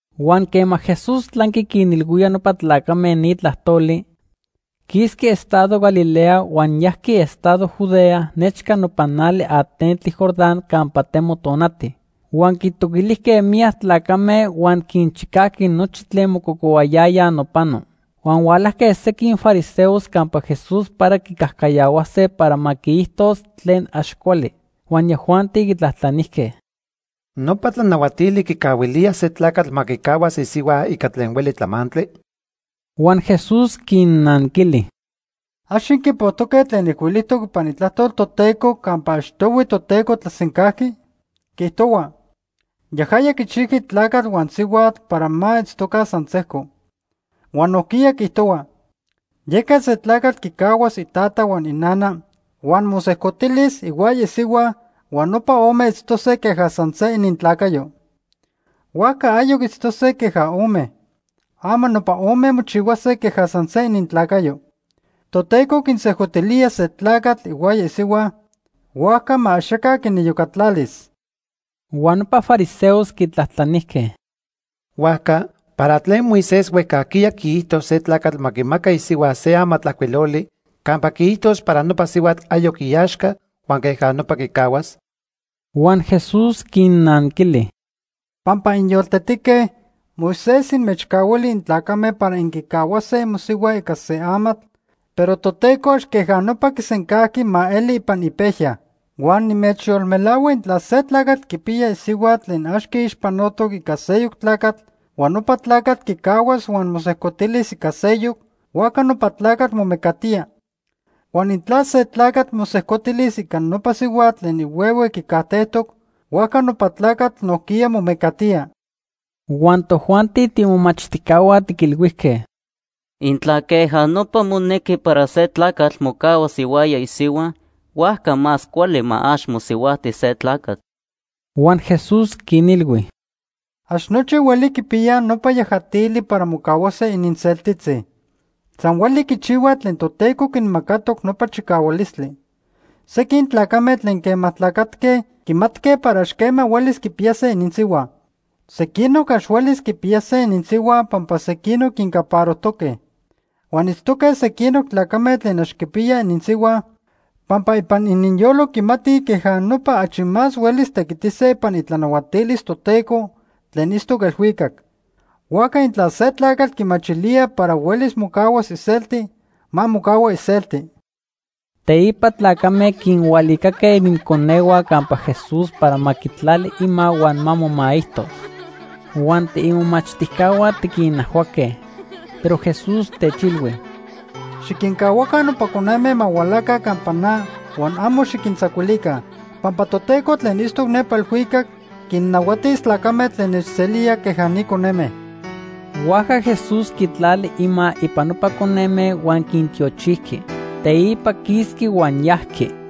Huan quema Jesús tlanqui quinilhuía nopa tlacame ni tlajtoli, quisqui estado Galilea huan yajqui estado Judea nechca nopa nali atentli Jordán campa temo tonati. Huan quitoquilijque miyac tlacame huan quinchicajqui nochi tlen mococohuayayaj nopano. Huan hualajque sequin fariseos campa Jesús para quicajcayahuase para ma quiijtos tlen ax cuali. Huan yajuanti quitlajtlanijque: ―¿Nopa tlanahuatili quicahuilía se tlacatl ma quicahuas isihua ica tlen hueli tlamantli? Huan Jesús quinnanquili: ―¿Ax inquipojtoque tlen ijcuilijtoc ipan Itlajtol Toteco campa achtohui Toteco tlasencajqui? Quiijtohua: ‘Yajaya quichijqui tlacatl huan sihuatl’ para ma itztoca san sejco. Huan nojquiya quiijtohua: ‘Yeca se tlacatl quicahuas itata huan inana huan mosejcotilis ihuaya isihua huan nopa ome itztose queja san se inintlacayo.’ Huajca ayoc itztose queja ome. Ama nopa ome mochihuase queja san se inintlacayo. Toteco quinsejcotilía se tlacatl ihuaya isihua; huajca ma axaca quiniyocatlalis. Huan nopa fariseos quitlajtlanijque: ―Huajca ¿para tlen Moisés huejcajquiya quiijto se tlacatl ma quimaca isihua se amatlajcuiloli campa quiijtos para nopa sihuatl ayoc iaxca huan queja nopa quicahuas? Huan Jesús quinnanquili: ―Pampa inyoltetique, Moisés inmechcahuili intlacame para inquicahuase imosihua ica se amatl, pero Toteco ax queja nopa quisencajqui ma eli ipan ipejya. Huan nimechyolmelahua intla se tlacatl quipiya isihua tlen ax quiixpanotoc ica seyoc tlacatl huan nopa tlacatl quicahuas huan mosejcotilis ica seyoc, huajca nopa tlacatl momecatía. Huan intla se tlacatl mosejcotilis ica nopa sihuatl tlen ihuehue quicajtejtoc, huajca nopa tlacatl nojquiya momecatía. Huan tojuanti tiimomachtijcahua tiquilhuijque: ―Intla queja nopa monequi para se tlacatl mocahuas ihuaya isihua, huajca más cuali ma ax mosihuajti se tlacatl. Huan Jesús quinilhui: ―Ax nochi hueli quipiyaj nopa yajatili para mocahuase ininseltitzi. San hueli quichihuaj tlen Toteco quinmacatoc nopa chicahualistli. Sequin tlacame tlen quema tlacatque quimatque para ax quema huelis quipiyase ininsihua. Sequinoc ax huelis quipiyase ininsihua pampa sequinoc quincaparojtoque. Huan itztoque sequinoc tlacame tlen ax quipiyaj ininsihua pampa ipan ininyolo quimatij queja nopa achi más huelis tequitise ipan itlanahuatilis Toteco tlen itztoc elhuicac. Huajca intla se tlacatl quimachilía para huelis mocahuas iselti, ma mocahua iselti. Teipa tlacame quinhualicaque ininconehua campa Jesús para ma quitlali ima huan ma momaijtos. Huan tiimomachtijcahua tiquinajhuaque. Pero Jesús techilhui: ―Xiquincahuaca nopa coneme ma hualaca campa na huan amo xiquintzacuilica. Pampa Toteco tlen itztoc nepa elhuicac quinnahuatis tlacame tlen nechselíaj queja ni coneme. Huajca Jesús quitlali ima ipan nopa coneme huan quintiochijqui. Teipa quisqui huan yajqui.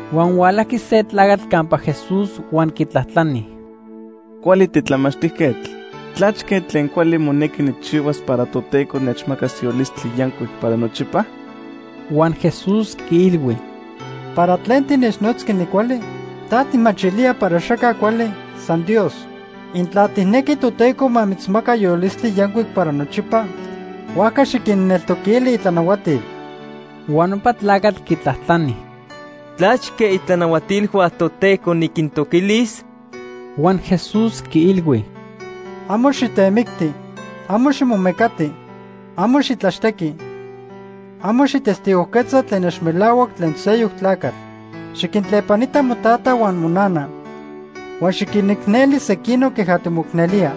Huan hualajqui se tlacatl campa Jesús huan quitlajtlani: ―Cuali titlamachtijquetl, ¿tlachque tlen cuali monequi nijchihuas para Toteco nechmacas yolistli yancuic para nochipa? Huan Jesús quiilhui: ―¿Para tlen tinechnotzqui nicuali? ¿Ta tijmachilía para axaca cuali, san Dios? Intla tijnequi Toteco ma mitzmaca yolistli yancuic para nochipa, huajca xiquinneltoquili itlanahuatil. Huan nopa tlacatl quitlajtlani: ―¿Tlachque itlanahuatilhua Toteco niquintoquilis? Huan Jesús quiilhui: ―Amo xitemicti, amo ximomecati, amo xitlaxtequi, amo xijtestigojquetza tlen ax melahuac tlen seyoc tlacatl. Xiquintlepanita motata huan monana. Huan xiquinicneli sequinoc queja timoicnelía.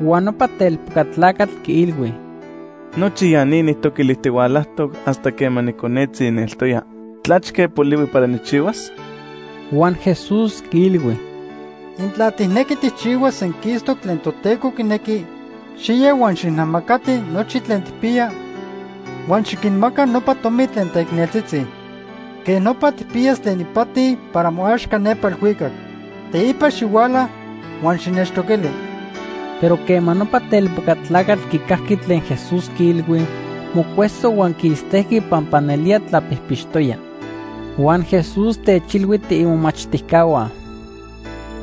Huan nopa telpoca tlacatl quiilhui: ―Nochi ya ni nijtoquilijtihualajtoc hasta quema niconetzi nieltoya. ¿Tlachque polihui para nijchihuas? Huan Jesús quiilhui: ―Intla tijnequi tijchihuas senquistoc tlen Toteco quinequi, xiya huan xijnamacati nochi tlen tijpiya huan xiquinmaca nopa tomi tlen teicneltzitzi. Quej nopa tijpiyas tlen ipati para moaxca nepa elhuicac. Teipa xihuala huan xinechtoquili. Pero quema nopa telpoca tlacatl quicajqui tlen Jesús quiilhui, mocueso huan quistejqui pampa nelía tlapijpixtoya. Huan Jesús techilhui tiimomachtijcahua: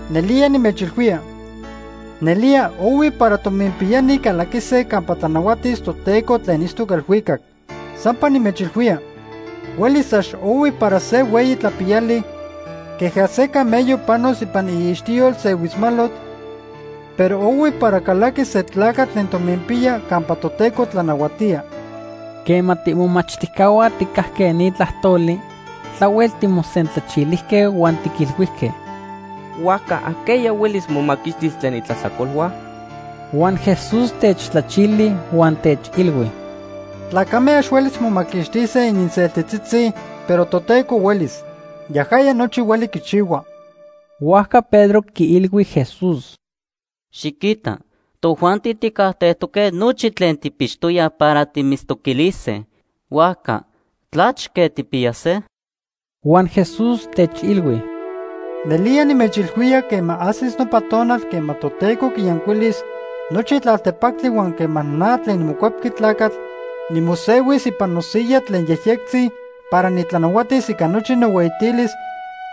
―Nelía nimechilhuía, nelía ohui para tominpiyani calaquise campa tlanahuatis Toteco tlen itztoc elhuicac. Sampa nimechilhuía, huelis ax ohui para se hueyi tlapiyali queja se camello panos ipan iixtiyol se huitzmalotl, pero ohui para calaquis se tlacatl tlen tominpiya campa Toteco tlanahuatía. Quema tiimomachtijcahua tijcajque ni tlajtoli, tlahuel timosentlachilijque huan tiquilhuijque: ―Huajca ¿ajqueya huelis momaquixtis tlen itlajtlacolhua? Huan Jesús techtlachili huan techilhui: ―Tlacame ax huelis momaquixtise ininseltitzitzi, pero Toteco huelis. Yajaya nochi hueli quichihua. Huajca Pedro quiilhui Jesús: ―Xiquita, tojuanti tijcajtejtoque nochi tlen tijpixtoyaj para timitztoquilise. Huajca ¿tlachque tijpiyase? Huan Jesús techilhui: ―Nelía nimechilhuía quema ajsis nopa tonal quema Toteco quiyancuilis nochi tlaltepactli huan quema na tlen niMocuepqui Tlacatl nimosehuis ipan nosiya tlen yejyectzi para nitlanahuatis ica nochi nohueyitilis,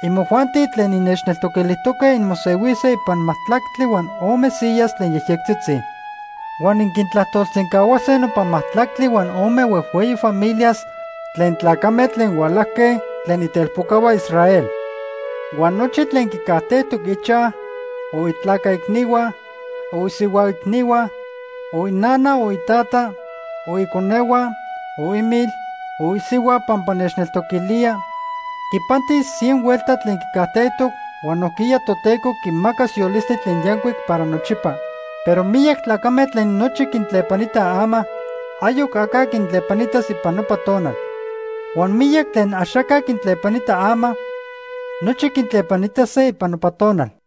imojuanti tlen innechtoquilijtoque inmosehuise ipan majtlactli huan ome siyas tlen yejyectzitzi. Huan inquintlajtolsencahuase nopa majtlactli huan ome huejhueyi familias tlen tlacame tlen hualajque tlen itelpocahua Israel. Huan nochi tlen quicajtejtoc ichaj, o itlaca icnihua, o isihua icnihua, o inana, o itata, o iconehua, o imil, o isihua pampa nechneltoquilíaj, quipantis cien huelta tlen quicajtejtoc huan nojquiya Toteco quimacas yolistli tlen yancuic para nochipa. Pero miyac tlacame tlen nochi quintlepanitaj ama, ayoc aca quintlepanitas ipan nopa tonal. Huan miyac tlen axaca quintlepanita ama, nochi quitlepanitase ipan nopa tonal.